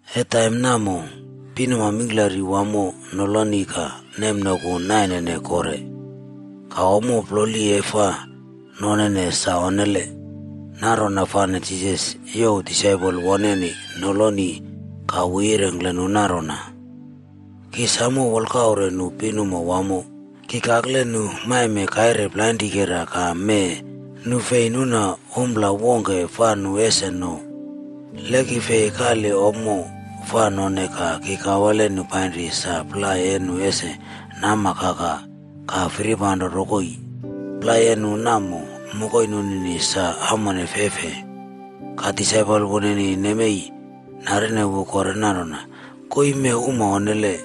E taim namo, pinuma mingklari wamo noloni ka nemnoku nainene kore. Ka ommo ploli e fa nonene sa onnele. Nanrona fane Jisas youw disaipol woneni noloni ka wu yirengkle nu nanrona, “Ki samo wolkaure nu pinuma wamo. Ki kakle nu maime kaire plainrikera ka mee nu fi nuna ompla wongke fa nu ese no. Le ki fi kali ommo fa none ka ki kawale nu painri sa plai e nu ese nama kaka ka firipanro rokoi. Plai e nu namo, mokoi nunini sa amon feifei.” Ka disaipol woneni nemei narine wu kore nanrona, “Koii mee uma onnele!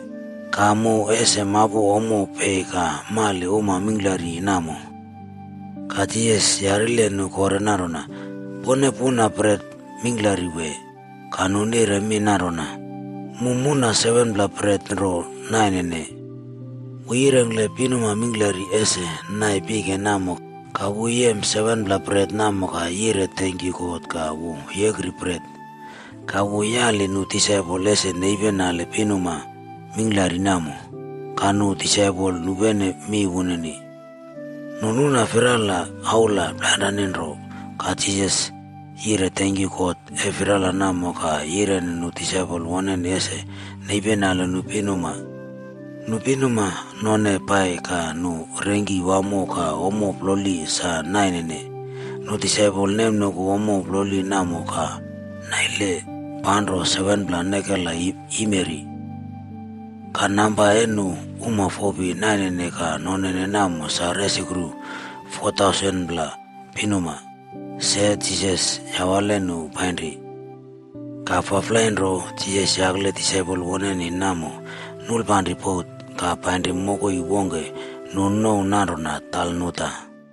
Ka mu ese mapu ommo pei ka male uma mingklari namo?” Ka Jisas yarile nu kore nanrona, “Pone puna bret mingklari wee?” Ka nu nire mi nanrona, “Mu muna 7pla bret nro nainene.” Wu yirengkle pinuma mingklari ese nai pike namo ka wu yem 7pla bret namo ka yire tenkyu God ka wu yekri bret. Ka, wu yaliye nu disaipol ese nepinali pinuma mingklari namo. Ka nu disaipol nupene mi wunini. Nu nuna firala aula plainrane nro. Ka Jisas yire tenkyu God e firala namo, ka yireni nu disaipol woneni ese nepinali nu pinuma. Nu pinuma none pai ka nu rengki wamo ka ommo ploli sa nanaine. Nu disaipol nemnoku ommo ploli namo ka naile panro 7pla nekela yimeri. Ka namba e nu uma fopi nainene ka nonene namo sa resukru 4,000pla pinuma. Se Jisas yawale nu painri. Ka faflai nro, Jisas yakle disaipol woneni namo, nulpanri bot ka painri mokoi wongke nu nouw nanrona Dalmanuta.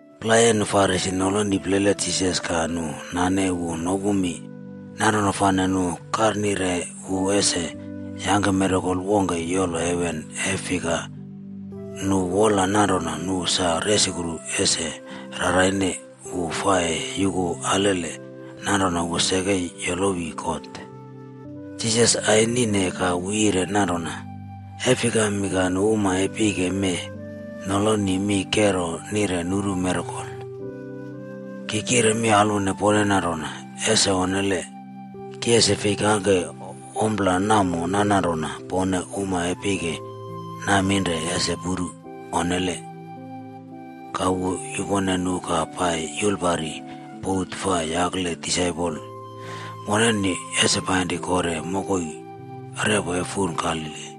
Plai e nu Farisi noloni plele Jisas ka nu nane wu nopu mi. Nanrona fane nu karnarine wu ese yangke mirakel wongke yolo heven e fika nu wola nanrona nu sa resukru ese rarnane wu fa e yuku alele nanrona wu seke yolowi God. Jisas anine ka wu yire nanrona, “E fikami ka nu uma e pike mee noloni mi kero nire nuru mirakol? Ki kire mi alwone pone nanrona, ese onnele. Ki ese fi kangke ommo namo nananrona pone uma e pike naminre ese puru. Onnele!” Ka wu yupone nu ka pai yulpari bot fa yakle disaipol woneni ese painri kore mokoi repo e fun Galili.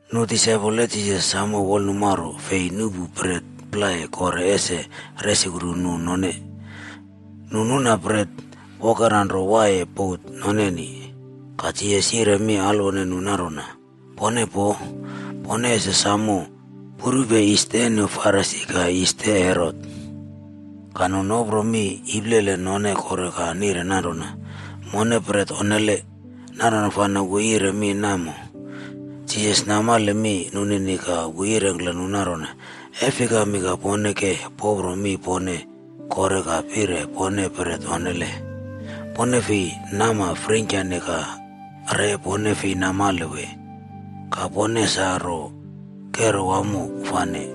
Nu disaipol e Jisas samo wolnumaro fi nuꞌpu bret plai kore ese resukru nu none. Nu nuna bret wokera nro waiye bot noneni. Ka Jisas yire mi alele nu nanrona, “Pone poo. Pone ese samo purupe yis e nu Farisi ka yis e Herot.” Ka nu nopro mi iplele none kore ka nire nanrona, “Mone bret onnele, nanrona fane wu yire mi namo.” Jisas namale mi nunini ka wu yirengkle nu nanrona, “E fikami ka pone ke popro mi pone kore ka pire pone bret onnele? Pone fi nama freingkyane ka re pone fi namale wee? Ka poneni sa nro kero wamo fane?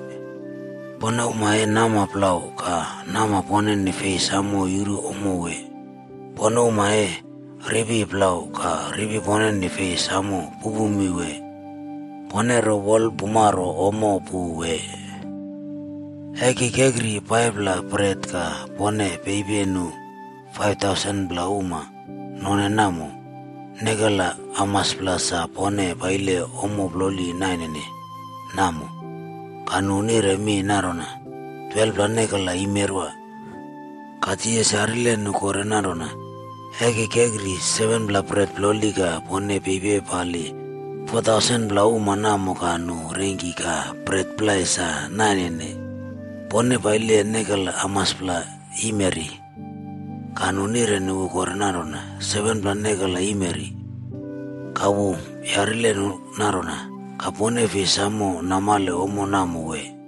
Pone uma e nama plau, ka nama poneni fei samo yuru ommo wee? Pone uma e ripi plau ka ripi pone fei samo pupu mi wee? Pone ro wolpumaro ommo pu wee? E ki kekri 5pla bret ka pone pepi nu 5,000pla uma none namo, nekela hamaspla sa pone paile ommo ploli nainene namo?” Ka nu nire mi nanrona, “12pla nekela yimeri.” Ka Jisas yarile nu kore nanrona, “E ki kekri 7pla bret ploli ka pone pepali 4,000pla uma namo ka nu rengki ka bret plai sa nanaine, pone paile nekela hamaspla yimeri?” Ka nu nireni wu kore nanrona, “7pla nekela yimeri.” Ka wu yarile nu nanrona, “Ka pone fi saimo namale ompla namo wee?”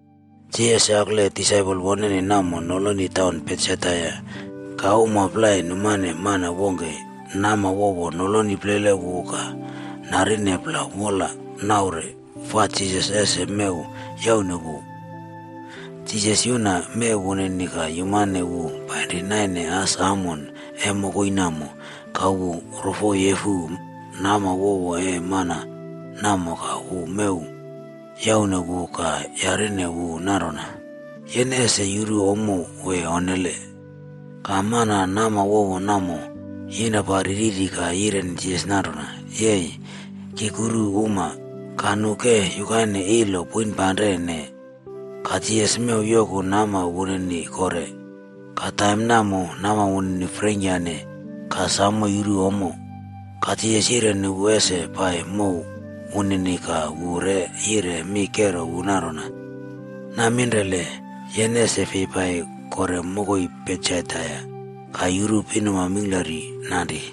Jisas yakle disaipol woneni namo noloni taun Betsaida ka uma plai numane mana wongke nama wowo noloni plele wu ka narine plau wol naure fa Jisas ese mew yaune wu. Jisas yuna mew wunini ka yumane wu painri naine as amon e mokoi namo, ka wu rofoyefu nama wowo e mana namo ka wu mew yaune wu ka yarine wu nanrona, “Yene ese yuru ommo wee onnele?” Ka mana nama wowo namo yinrapari riri ka yireni Jisas nanrona, “Yei, ki kuru uma. Ka nu ke yukaine ilo poinpanrene.” Ka Jisas mew yoku nama wunini kore. Ka taim namo nama wunini freingkyane ka samo yuru ommo. Ka Jisas yireni wu ese pai mow wunini ka wu re yire mi kero wu nanrona, “Naminrele yene ese fi pai kore mokoi Betsaida ka yuru pinuma mingklari nanri.”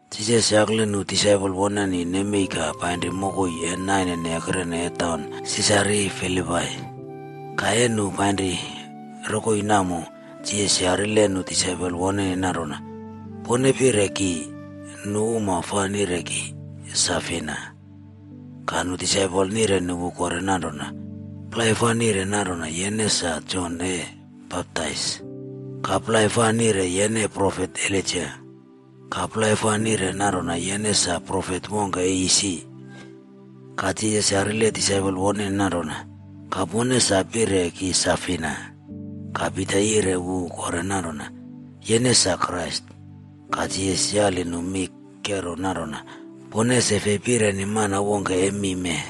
Jisas yakle nu disaipol woneni nemei ka painri mokoi e nainene ekrene e taun Sisaria Filipai. Ka e nu painrine rokoi namo, Jisas yarile nu disaipol woneni nanrona, “Pone pire ki, nu uma fa nire ki sa fina?” Ka nu disaipol nireni wu kore nanrona, “Plai fa nire nanrona yene sa Jon E Baptais. Ka plai fa nire yene profet Elaija. Ka plai fa nire nanrona yene sa profet wongke e isi.” Ka Jisas yarile disaipol woneni nanrona, “Ka pone sa pire ki sa fina?” Ka Pita yire wu kore nanrona, “Yene sa Krais.” Ka Jisas yali nu mi kero nanrona, “Pone ese fi pireni mana wongke e mi mee.”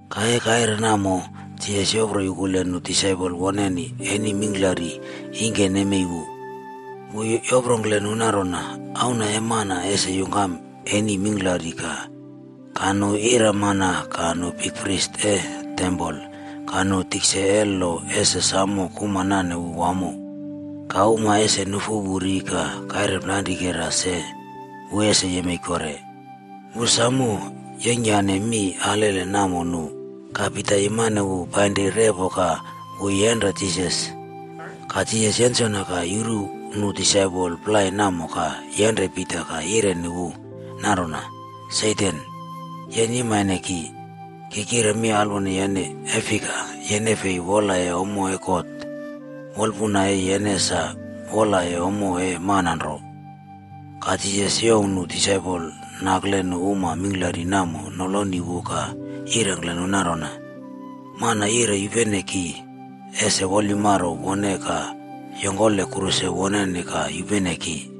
Ka e kaire namo, Jisas yopro yukule nu disaipol woneni eni mingklari ingke nemei wu. Wu yoprongkle nu nanrona, “Auna e Mana ese yungkam eni mingklari ka nu iramana, ka nu bikpris e tempol, ka nu tikse e lo ese samo kuma nane wu wamo. Ka uma ese nufu wu ri ka kaire plainrikera se, wu ese yemei kore.” Wu samo yeingkyane mi alele namo nu. Ka Pita yumane wu painri repo ka wu yenre Jisas. Ka Jisas yensona ka yuru nu disaipol plai namo ka yenre Pita ka yireni wu nanrona, “Satan, yene yimaine ki! Ki kire alwone yene, e fika yene fi wolaye ommo e God, wolpuna e yene sa wolaye ommo e mana nro.” Ka Jisas youw nu disaipol nakle nu uma mingklari namo noloni wu ka yirengkle nu nanrona, “Mana yire yupene ki, ese wolyumaro wone ka yongkole kruse woneni ka yupene ki.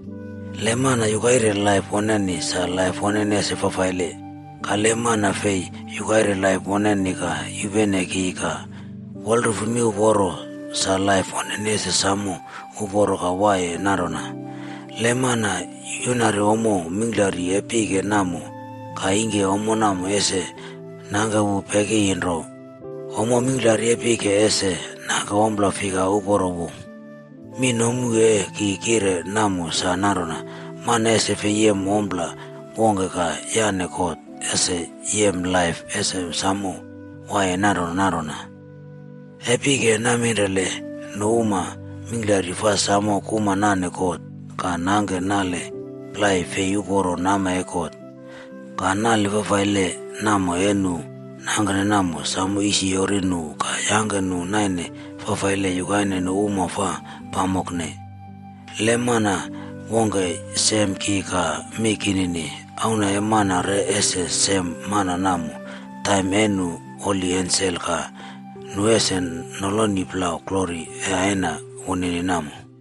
Le mana yukaire laip woneni, sa laip woneni ese fafaile. Ka le mana fi yukaire laip woneni ka yupene ki ka wolrufu miuporo, sa laip wunini ese samo uporo ka waiye nanrona. Le mana yunari ommo mingklari e pike namo, ka ingke ommo namo ese nangke wu pekiyi nro, ommo mingklari e pike ese nangke ommo fika uporo wu? Mi nomu e ki kire namo sa nanrona, mana ese fi yem ompla wongke ka yane God ese yem laip ese samo waiye nanrona nanrona. E pike naminrele nu uma mingklari fa samo kuma nane God ka nangke nale plai fi uporo nama e God, ka nale fafaile namo e nu nangke namo samo yisiyori nu ka yangke nu naine faifaile yukaine nu uma fa pamokne. Le mana wongke sem ki ka mi kinini, Auna e Mana re ese sem mana namo taim e nu holi ensel ka nu ese noloni plau glori e Aina wunini namo.”